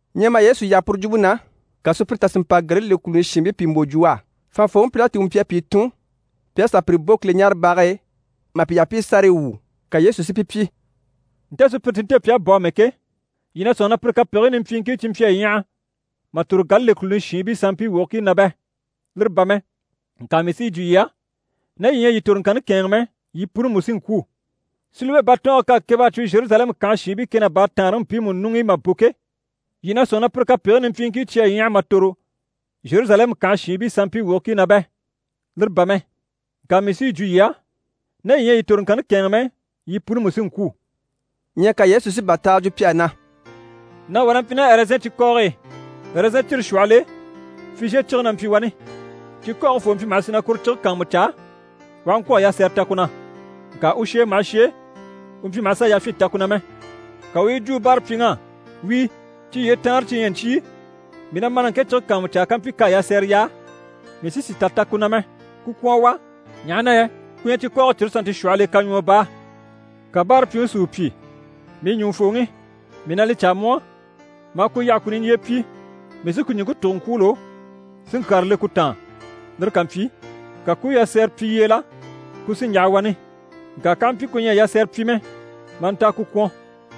Ɲyɛ mà Yesu yaha puru jwumpe na, ka sùpyire tà si mpa Galile kùluni shiinbii pìi mbò jwo u á. Fànhafooŋi Pilati u mpyi a pìi tun pi à sà pire bò Kileɲaarebage e mà pi yaha pi i sárayi wwû. Ka Yesu si pi pyi: «Nte sùpyire ti nte pi à bò amɛ ke, yii na sɔ̂nŋi na pire kapegigii nimpyiiŋkii cyi mpyi a ɲyaha mà tòro Galile kùluni shiinbii sanmpii wogigii na bɛ? Lire bà mɛ, ŋka mii sí yi jwo yii á, ná yii ɲyɛ a yii toroŋkanni kɛ̂ɛnŋɛ mɛ, yii puni mú sí n‑kwû. Silowe batɔɔnge k'à keb'a cwo Zheruzalɛmu kànhe shiinbii kɛ ná baataanreŋi mpiimu ɲuŋ'i mà bò ke, yii na sɔ̂nŋi na pire kapegigii nimpyiiŋkii cyi à ɲyaha mà tòro Zheruzalɛmu kànhe shiinbii sanmpii wogigii na bɛ? Lire bà mɛ, ŋka mii sí yi jwo yii á, ná yii ɲyɛ a yii toroŋkanni kɛ̂ɛnŋɛ mɛ, yii puni mú sí n-kwû.» Ɲyɛ ka Yesu si bàtaaga jwo pi á na: «Nàŋi wà na mpyi ná ɛrɛzɛn cikɔɔge e. Ɛrɛzɛn cire shwɔhɔl'e fizhiye cige na mpyi wani. Cikɔɔge foo mpyi maha sì na kuru cige kàanmucaa u aha ŋkwɔ̀ a yasɛrɛ ta ku na. Ŋka u shèe maha shèe, u mpyi maha sà yafyin ta ku na mɛ. Ka u u yi jwo u báarapyiŋ'á “Wíi, cyi yyee taanre cyi ɲyɛ ɲcyii, mii na ma na ŋke cige kàanmucaa kampyi k'à yasɛrɛ yaa, mii sí sì tà ta ku na mɛ. Ku kwɔ̀n à wà, ɲaha na yɛ ku ɲyɛ cikɔɔge cire sannte shwɔhɔl'e kaɲwɔɔ baa.” Ka báarapyiŋi si u pyi “Mii ɲùŋufooŋi, mii na li caa mu á, maa ku yaha ku niɲjyee pyi, mii sí ku ɲùŋke tùgo n‑kwûulo si ŋkyàra le ku taan. Lire ká mpyi, ka ku u yasɛrɛ pyi yyeela, ku sí n‑yaha wani. Ŋka k'aha mpyi ku ɲyɛ a yasɛrɛ pyi mɛ, maa nta a ku kwɔ̀n.”»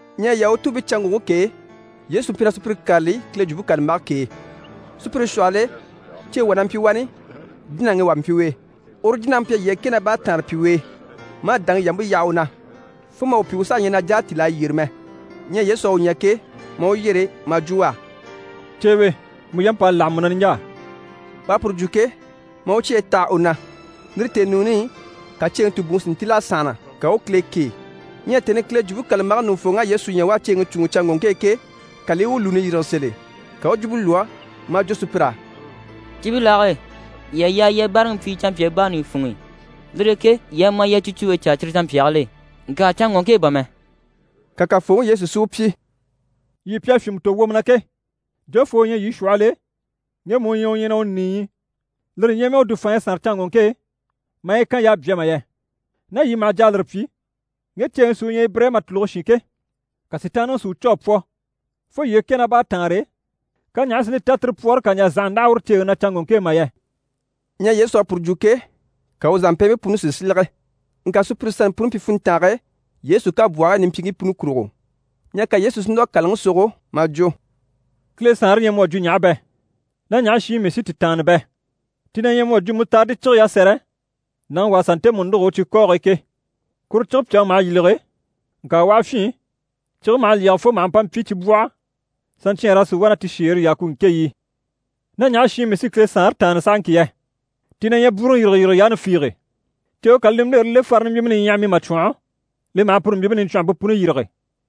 Ɲyɛ Yahutuubiicanŋɔŋke k'e, Yesu mpyi na sùpyire kâlali Kile Jwumpe kàlambage k'e. Sùpyire shwɔhɔl'e ceeŋi wà na mpyi wani, jínaŋi wà mpyi u e, uru jínaŋi mpyi a yyee kɛ ná baataanre pyi u e, maa dàŋi yampe yaha u na, fo mà u pyi u saha ɲyɛ na jà a tíl'a yyére mɛ. Ɲyɛ Yesu à u ɲya ke, maa u yyere maa jwo u á: «Ceewe, mu yamp'à láha mu na niɲjaa.» U à puru jwo ke, maa u cyeyi taha u na, lire tèenuuni i, ka ceeŋi tùbuŋi si ntíl'a sànhana, ka u u Kile kêe. Ɲyɛ tèni i Kile Jwumpe kàlambage ɲùŋufooŋ'à Yesu ɲya u à ceeŋi cùuŋɔ canŋɔŋke e ke, ka li i u lùuni yîrige sèl'e, ka u u jwumpe lwɔ́ maa jwo sùpyir'á: «Cibilaage e, yii à yaa yii a báaraŋi pyi canmpyaa baani funŋ'i, lire e ke yii a ma, yii a cicuumpe caa cyire canmpyaagil'e, ŋka canŋɔŋke e bà mɛ!» Ka Kafooŋi Yesu si u pyi: «Yii pi à fyìnmɛ tò wwomɔ na ke, jofoo u ɲyɛ yii shwɔhɔl'e ŋgemu u ɲyɛ u ɲyɛ na u nìiyi, lire ɲyɛ mɛ u dùfaanɲyi sànre canŋɔŋke e maa yi kan y'à bya mà yɛ? Ná yii maha jà a lire pyi, ŋge ceeŋi sí u ɲyɛ Ibirayima tùluge shin ke, ka Sitaanniŋi si u cû a pwɔ, fo yyee kɛ ná baataanre e, ka ɲaha si li ta tire pwɔɔre kà ɲjà zànha ndáha uru ceeŋi na canŋɔŋke e mà yɛ?» Ɲyɛ Yesu à puru jwo ke, ka u zàmpɛɛnbii puni si silege. Ŋka sùpyire sannte puni mpyi funntange e Yesu kabwɔhigii nimpyiiŋkii puni kurugo. Ɲyɛ ka Yesu si núr'a kàlaŋi sogo maa jwo: «Kile Saanre ɲyɛ mu à jwo ɲaha bɛ? Ná ɲaha shi i mii sí ti tàanna bɛ? Ti na ɲyɛ mu à jwo mutaridi cige yasɛrɛ, nàŋi wà a sà ntemu nûgo u cikɔɔge e ke. Kuru cige pyàŋi maha yîlege, ŋka u aha fyîn, cige maha lyɛge fo maha mpa mpyi cibwɔhɔ, saɲcyɛɛnr'a sì wá na ti shèere yaa ku ŋkéɲyi i.» «Ná ɲaha shi i mii sí Kile Saanre tàanna sahaŋki yɛ? Ti na ɲyɛ bwúuruŋi yîrigeyirige yaani fiige. Ceewe ká li nimbilere le farini mbyìmɛ niɲyaham'i mà cwɔ̀nhɔ, li maha puru mbyìmpe niɲcwɔnhɔmpe puni yîrige.»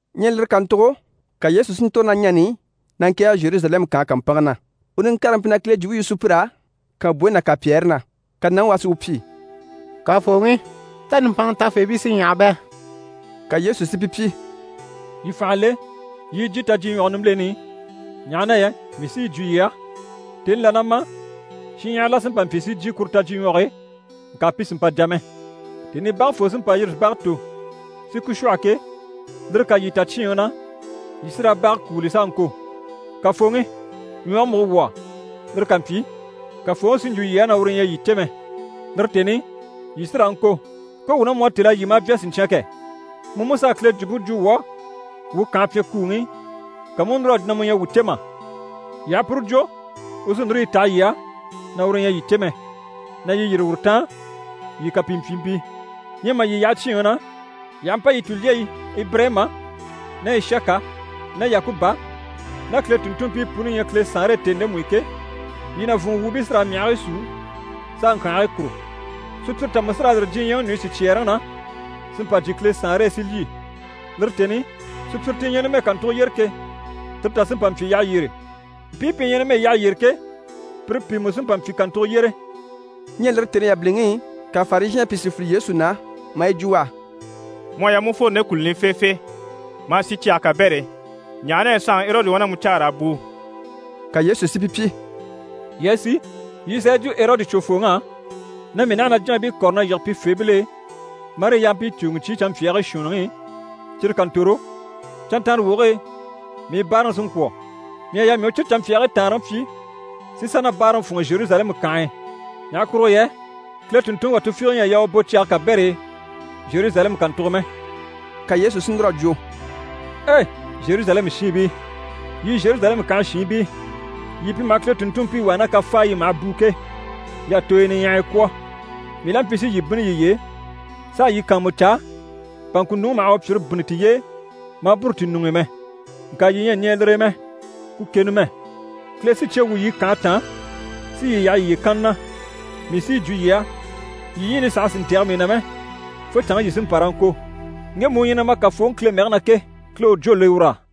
Ɲyɛ lire kàntugo ka Yesu si ntòro ná ɲani i, na ŋkɛ̀ɛge Zheruzalɛmu kànhe kàmpanŋke na. U niŋkareŋi mpyi na Kile jwumpe yu sùpyir'á kànbwoyi ná kànpyɛɛre na. Ka nàŋi wà si u pyi: «Kafooŋi, tá nùmpanŋa tafeebii sí ɲyaha bɛ?» Ka Yesu si pi pyi: «Yii fànha le yii i jyè tajyiɲwɔge nimbileni i, ɲaha na yɛ mii sí yi jwo yii á, tèni là na ma shinɲyahara la sí n‑pa n‑pyi si jyè kuru tajyiɲwɔge e, ŋka pi sì n‑pa jà mɛ. Tèni i bage foo sí n‑pa n-yîri si bage tò si ku shwɔ̂hɔ ke, lire ká yii ta cyíinŋi na, yii sí raa bage kúuli s'a ŋko “Kafooŋi! Ɲwɔge múgo wuu á.” Lire ká mpyi, Kafooŋi sí n‑jwo yii á na uru ɲyɛ a yii cè mɛ. Lire tèni i, yii sí raa ŋko “Ko wuu ná mu à têl'a lyî maa bya siɲcyan kɛ! Mu mú s'à Kile jwumpe jwo wuu á wuu kànhe pyɛnkuuŋi i, ka mu u núr'a jwo na mu ɲyɛ a wuu cè mà?” Yii aha puru jwo, u sí núru yi taha yii á na uru ɲyɛ a yii cè mɛ, na yii yîri uru taan, yii kapimpyiibii. Ɲyɛ mà yii yaha cyíinŋi na, yii aha mpa yii tulyeyi Ibirayima ná Ishaka ná Yakuba ná Kile tùnntunmpii puni ɲya Kile Saanre e tèni ndemu i ke, yii nàvunŋɔ wuubii sí raa myahigii súu s'a ŋkyànhigii kùru. Sùpyire tà mú sí raa yîri diɲyɛŋi ɲùɲyi sicyɛɛreŋi na, si mpa jyè Kile Saanre e, si lyî. Lire tèni i, sùpyire ti ɲyɛ numɛ kàntugo yyére ke, tire tà sí n‑pa n‑pyi yyaha yyére. Mpii pi ɲyɛ numɛ yyaha yyére ke, pire pìi mú sí n‑pa n‑pyi kàntugo yyére.» Ɲyɛ lire tèni yabiliŋi i, ka Farizhɛɛnbii pìi si file Yesu na, maa yi jwo u á: «Mu à yaa mu u fworo nde kùluni i feefee, ma a sì cyage kabɛr'e, ɲaha na yɛ saanŋi Erɔdi wá na mu caa raa bùu.» Ka Yesu si pi pyi: «Yii a sì, yii i sà yi jwo Erɔdi cwofooŋ'á, na mii naha na jínabii kɔ̀re na yige pifeebil'e marii yampii cùuŋi ɲcyii canmpyaagii shuunniŋi i, cyire ká ntòro, canntanrewoge e mii báaraŋi sí n‑kwɔ̀. Mii à yaa mii u cyire canmpyaagii taanreŋi pyi si sà na báaraŋi fûnŋɔ Zheruzalɛmu kànhe e. Ɲaha kurugo yɛ Kile tùnntunŋi wà tufiige ɲyɛ a yaa u bò cyage kabɛr'e Zheruzalɛmu kàntugo mɛ.» Ka Yesu sí núr'a jwo: «Ei! Zheruzalɛmu shiinbii, yii Zheruzalɛmu kànhe shiinbii, yii pi maha Kile tùnntunmpii wà ná kafaayi i maha bùu ke, y'à tooyo niɲyahaya kwɔ̀, mii la mpyi si yii bínni yiye e, s'a yii kàanmucaa, bà ŋkùnuŋi maha u pyìre bínni tiye e maa bûru ti ɲuŋ'i mɛ. Ŋka yii ɲyɛ a ɲɛɛ lire e mɛ. Ku ke numɛ! Kile sí cye wwû yii kànhe taan si yii yaha yiye kanna na. Mii sí yi jwo yii á, yii ɲyiini saha sì n‑tɛ̀gɛ mii na mɛ, fo canŋke yii sí n‑pa raa ŋko “Ŋgemu u ɲyɛ na ma Kafooŋi Kile mɛgɛ na ke, Kile u jwó le ur'á.”»